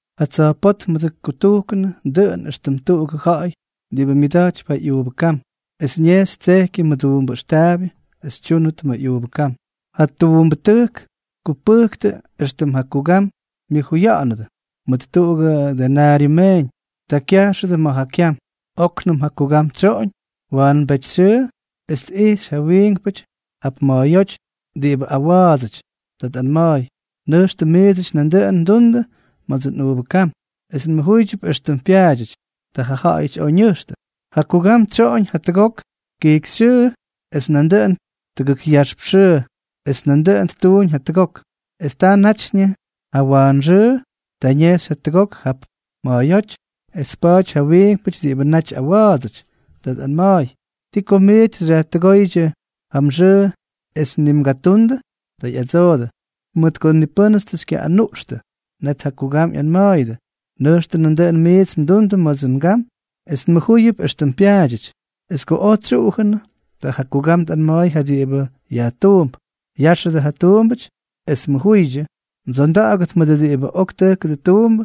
’Ja tsa̱jpótmʉdʉ kutujkʉnʉ dʉꞌʉn éxtʉm tuꞌugʉ ja̱ꞌa̱y diꞌibʉ myʉda̱jtypy ja ꞌyuuvʉ kam, es ñejxy tsejkyʉ mʉduumbʉ ʉxtaabyʉ es ttúnʉt ma̱ ꞌyuuvʉ kam. Ja tuumbʉtʉjk tkupʉjktʉ éxtʉm ja kugam myʉjuya̱ꞌa̱nʉdʉ mʉt tuꞌugʉ denaryʉ meeñ. Ta kyajxʉdʉ ma̱ ja kyam. Oknʉm ja kugam tsyoꞌoñ wa̱a̱mbetyxyʉʉ, es tꞌijxy ja wiinkpʉty jap ma̱a̱yóty diꞌibʉ awa̱a̱dsʉty. Ta tꞌanma̱a̱y: “Nʉjxtʉ miidsʉty nandʉꞌʉn mdundʉ ma̱dsʉ nꞌuuvʉ kam, es nmʉjúyʉp éxtʉm pyaadyʉty.” Ta jaꞌajʉty oj ñʉjxtʉ. ’Ja kugam tsyoꞌoñ jatʉgok kijkyxyʉʉ, es nandʉꞌʉn tʉgʉk yaxp xyʉʉ, es nandʉꞌʉn ttuuñ jatʉgok. Es ta natyñʉ éxtʉm jawaanxʉʉ, ta ñejxy jatʉgok jap ma̱a̱yóty, es tpaty ja wiinkpʉty diꞌibʉ naty awa̱a̱dsʉty. Ta tꞌanma̱a̱y: “¿Ti ko miits xyajtʉgóydyʉ ja mxʉʉ es ni mgatundʉ?” Ta ꞌyadsoojʉdʉ: “Mʉt ko ni pʉ́nʉts tʉ xykyaꞌꞌanuꞌxtʉ.” Net ja kugam ꞌyanma̱a̱yʉdʉ: “Nʉjxtʉ nandʉꞌʉn miits mdundʉ ma̱dsʉ ngam es nmʉjúyʉp éxtʉm pyaadyʉty.” ’Es ko oj tsyuꞌujʉnʉ, ta ja kugam tꞌanma̱a̱y ja diꞌibʉ yajtuump: “Yáxʉdʉ ja tuumbʉty es mʉjuydyʉ, mdsonda̱ꞌa̱gʉt mʉdʉ diꞌibʉ ok tʉjkʉdʉ tuumbʉ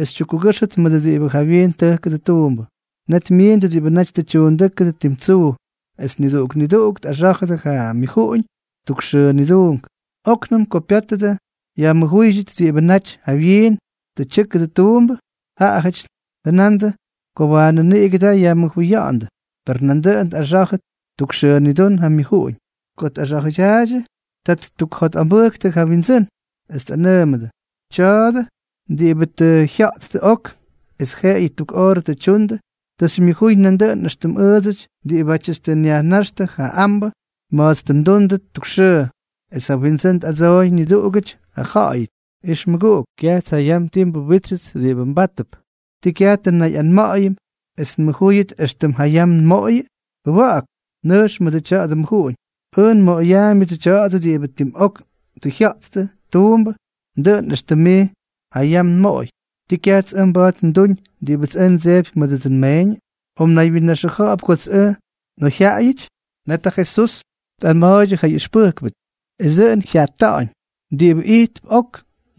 es xytyukkugʉ́xʉt mʉdʉ diꞌibʉ jawyiin tʉjkʉdʉ tuumbʉ.” Net myiindʉ diꞌibʉ naty tʉ tyuundʉ́kʉdʉ tim tsuu, es niduꞌuk niduꞌuk tꞌaxá̱jʉdʉ ja myʉjuꞌuñ tuk xʉʉ nidún. Oknʉm ko pyátʉdʉ yajmʉjúydyʉt diꞌibʉ naty jawyiin tʉ tyʉ́kʉdʉ tuumbʉ, jaꞌajʉty jʉnandʉ ko waanʉ niꞌigʉ da yajmʉjuya̱ꞌa̱ndʉ. Per nandʉꞌʉn tꞌaxa̱jʉ tuk xʉʉ nidún ja myʉjuꞌuñ. Ko tꞌaxa̱jʉdyaaydyʉ, ta ttukjotꞌambʉjktʉ ja wyindsʉ́n, es tꞌanʉʉmʉdʉ: “Tya̱a̱dʉ diꞌibʉ tʉ jya̱ꞌttʉ ok es jeꞌeyʉ tuk oorʉ tʉ tyundʉ, tʉ xymyʉjuy nandʉꞌʉn éxtʉm ʉʉdsʉty diꞌibátyʉts tʉ nyajnáxtʉ ja ambʉ ma̱ts tʉ ndundʉ tuk xʉʉ.” Es ja windsʉ́n tꞌadsooy niduꞌugʉty jaꞌajʉty: “Ix mʉguꞌuk, kyajts jayam ti nbuwítsyʉts diꞌibʉ mbátʉp. ¿Tii kyaj tʉ nnayꞌanma̱ꞌa̱yʉm es nmʉjúyʉt éxtʉm jayam nmoꞌoyʉ? Jʉwa̱ꞌa̱k. Nʉjx mʉdʉ tya̱dʉ mmʉjuꞌuñ. Ʉj nmoꞌoyaambyʉdsʉ tya̱a̱dʉ diꞌibʉ tim ok tʉ tyʉkʉ tuumbʉ dʉꞌʉn éxtʉm mij jayam nmoꞌoy. ¿Tii kyajts ʉj mba̱a̱t nduñ diꞌibʉts ʉj ndsejpy mʉdʉdsʉ nmeeñʉ? ¿O mnaywyinnaxʉja̱ꞌa̱p kots ʉj nꞌoyjyaꞌayʉty?” Net ja Jesús tꞌanma̱a̱ydyʉ ja ꞌyʉxpʉjkpʉty: —Es dʉꞌʉn jyata̱ꞌa̱ñ diꞌibʉ ijtp ok,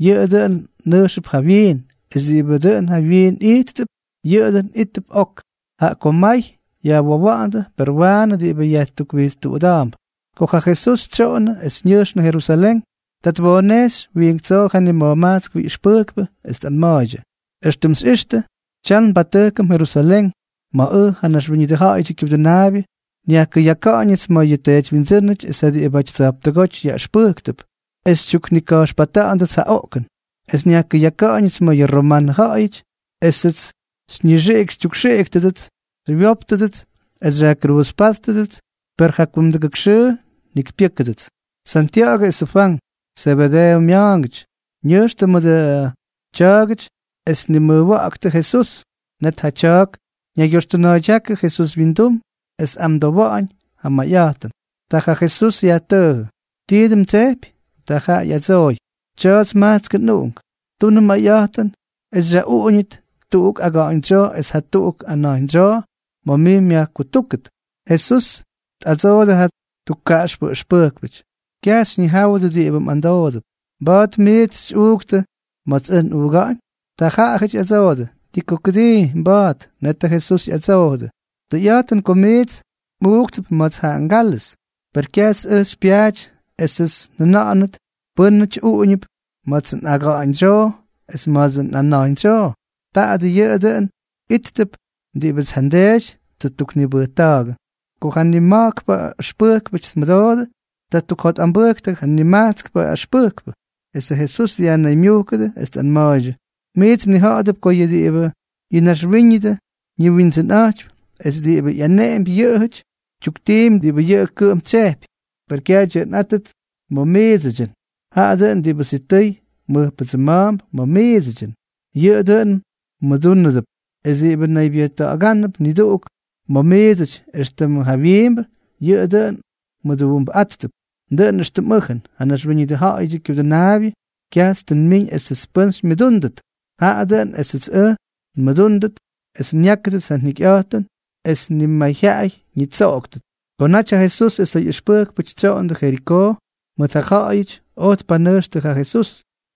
yʉꞌʉ dʉꞌʉn nʉjxʉp jawyiin; es diꞌibʉ dʉn jawyiin ijttʉp, yʉꞌʉ dʉn íttʉp ok. Jaꞌa ko may yajwowa̱ꞌa̱ndʉ, per waanʉ diꞌibʉ yajtukwijtstuꞌuda̱a̱mp. Ko ja Jesús tsyoꞌonnʉ es ñʉjxnʉ Jerusalén, ta twoonejxy wiink tsoo ja nima̱jmajtskpʉ ꞌyʉxpʉjkpʉ, es tꞌanma̱a̱ydyʉ: —Extʉm xyꞌixtʉ, tyam nbatʉjkʉm Jerusalén, ma̱ ʉj, ja Naxwíñʉdʉ Ja̱ꞌa̱yʉdyʉ Kyudʉnaabyʉ, nyajkʉyaka̱ꞌa̱ñʉts ma̱ ja teedywyindsʉ́nʉty es ja diꞌibʉty tsa̱jptʉgóty yaꞌʉxpʉjktʉp, es xytyuknika̱jxpata̱ꞌa̱ndʉts ja oꞌkʉn es nyajkʉyaka̱ꞌa̱ñʉts ma̱ yʉ romanʉ ja̱ꞌa̱yʉty esʉts xyñixiꞌik xytyukxiꞌiktʉdʉts, xywyóptʉdʉts es xyajkruuzpátʉdʉts, per ja kumdʉgʉk xʉʉ njikypyʉ́kʉdʉts. Santya̱ꞌa̱gʉ esʉ Fwank, Zebedeeʉ mya̱a̱ngʉty, ñʉjxtʉ mʉdʉ tya̱a̱gʉty es tnimʉjwa̱ꞌktʉ Jesús. Net ja tya̱a̱k ñaygyoxtʉna̱a̱ydyákʉ Jesús wyindum es tꞌamdowa̱ꞌa̱ñ ja mayꞌa̱jtʉn. Ta ja Jesús yajtʉʉjʉ: —¿Tii dʉn mdsejpy? Ta jaꞌa ꞌyadsooy: —Tya̱a̱ts majtskʉ nꞌuꞌunk. Tunʉ mayꞌa̱jtʉn es xyaꞌuꞌuñʉt tuꞌuk aga̱ꞌa̱ñdsyoo es jatuꞌuk ana̱jñdsyoo ma̱ mij myajkutúkʉt. Jesús tꞌadsoodʉ ja tukkaꞌaxpʉ ʉxpʉjkpʉty: —Kyaj xyñijáwʉdʉ diꞌibʉ mꞌamdoodʉp. ¿Mba̱a̱t miits xyꞌuuktʉ ma̱ ja kálʉz ma̱ts ʉj nꞌuuga̱ꞌa̱ñ? Ta jaꞌajʉty ꞌyadsoodʉ: —Ti ko kʉdii, mba̱a̱t. Netʉ Jesús ꞌyadsoojʉdʉ: —Tʉyꞌa̱jtʉn ko miits mꞌuuktʉp ma̱ts ja ngálʉz, per kyajts ʉj xypyaaty esʉts njʉna̱ꞌa̱nʉt pʉ́nʉty uꞌuñʉp ma̱ts nꞌaga̱ꞌa̱ñdsyoo es ma̱ts nꞌana̱jñdsyoo. Taadʉ yʉꞌʉ dʉꞌʉn íttʉp diꞌibʉts ja nDeety tʉ ttuknibʉjta̱a̱gʉ. Ko ja nima̱jkpʉ ʉxpʉjkpʉty tmʉdoodʉ, ta ttukjotꞌambʉjktʉ ja nimajtskpʉ ʉxpʉjkpʉ. Esʉ Jesús dyajnaymyujkʉdʉ, es tꞌanma̱a̱ydyʉ: —Miits mnija̱ꞌa̱dʉp ko yʉ diꞌibʉ yʉ naxwíñʉdʉ ñiwindsʉnꞌa̱jtypy es diꞌibʉ ꞌyaneꞌempy yʉꞌʉjʉty, tyuktiimpy diꞌibʉ yʉꞌʉ kʉꞌʉm tsyejpy. Per kyaj dyʉꞌʉnꞌátʉt ma̱ miidsʉdyʉn. Jaꞌa dʉꞌʉn diꞌibʉ sitʉy mʉjpʉdsʉma̱a̱mp ma̱ miidsʉdyʉn, yʉꞌʉ dʉꞌʉn mmʉdúnʉdʉp. Es diꞌibʉ naybyʉjta̱ꞌa̱gánʉp niduꞌuk ma̱ miidsʉty éxtʉmʉ jawyiimbʉ, yʉꞌʉ dʉꞌʉn mduumbʉꞌáttʉp. Dʉꞌʉn éxtʉm ʉj, ja Naxwíñʉdʉ Ja̱ꞌa̱yʉdyʉ Kyudʉnaabyʉ, kyajts tʉ nmiñ esʉts pʉ́n xymyʉdúndʉt, jaꞌa dʉꞌʉn esʉts ʉj nmʉdúndʉt es nyákʉdʉts ja njikyꞌa̱jtʉn es nimayjyaꞌay ñitsoꞌoktʉt. Ko naty ja Jesús es ja ꞌyʉxpʉjkpʉty tsyoondʉ Jerikoo, may ja ja̱ꞌa̱yʉty oj tpanʉjxtʉ ja Jesús.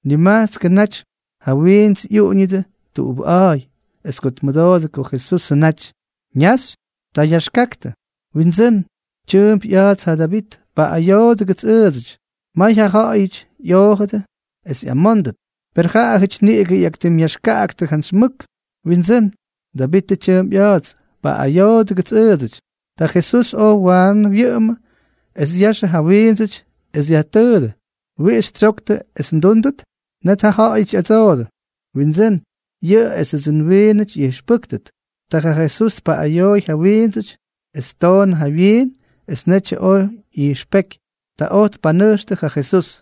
Nimajtskʉ naty ja wiints ꞌyuꞌuñʉdʉ tuꞌubʉꞌa̱a̱y. Es ko tmʉdoodʉ ko Jesusʉ naty ñaxy, ta yaxkaktʉ: —¡Windsʉ́n, tyʉʉmp ꞌya̱a̱ts ja Davit, paꞌꞌayoodʉgʉts ʉʉdsʉty! May ja ja̱ꞌa̱yʉty ꞌyoojʉdʉ es ꞌyamóndʉt, per jaꞌajʉty niꞌigʉ ꞌyaktimꞌyaxkaꞌaktʉ jantsy mʉk: —¡Windsʉ́n, Davitʉ tyʉʉmp ꞌya̱a̱ts, paꞌꞌayoodʉgʉts ʉʉdsʉty! Ta Jesús oj waanʉ wyʉꞌʉmʉ es dyaxʉ ja wiindsʉty, es dyajtʉʉdʉ: —¿Wiꞌix xytsyoktʉ es ndúndʉt? Net jaꞌajʉty ꞌyadsoodʉ: —Windsʉ́n, yʉꞌʉ esʉdsʉ nwiinʉty ꞌyijxpʉ́kʉt. Ta ja Jesús tpaꞌꞌayooy ja wiindsʉty, es ttoonʉ ja wyiin es netyʉ oj ꞌyijxpéky. Ta oj tpanʉjxtʉ ja Jesús.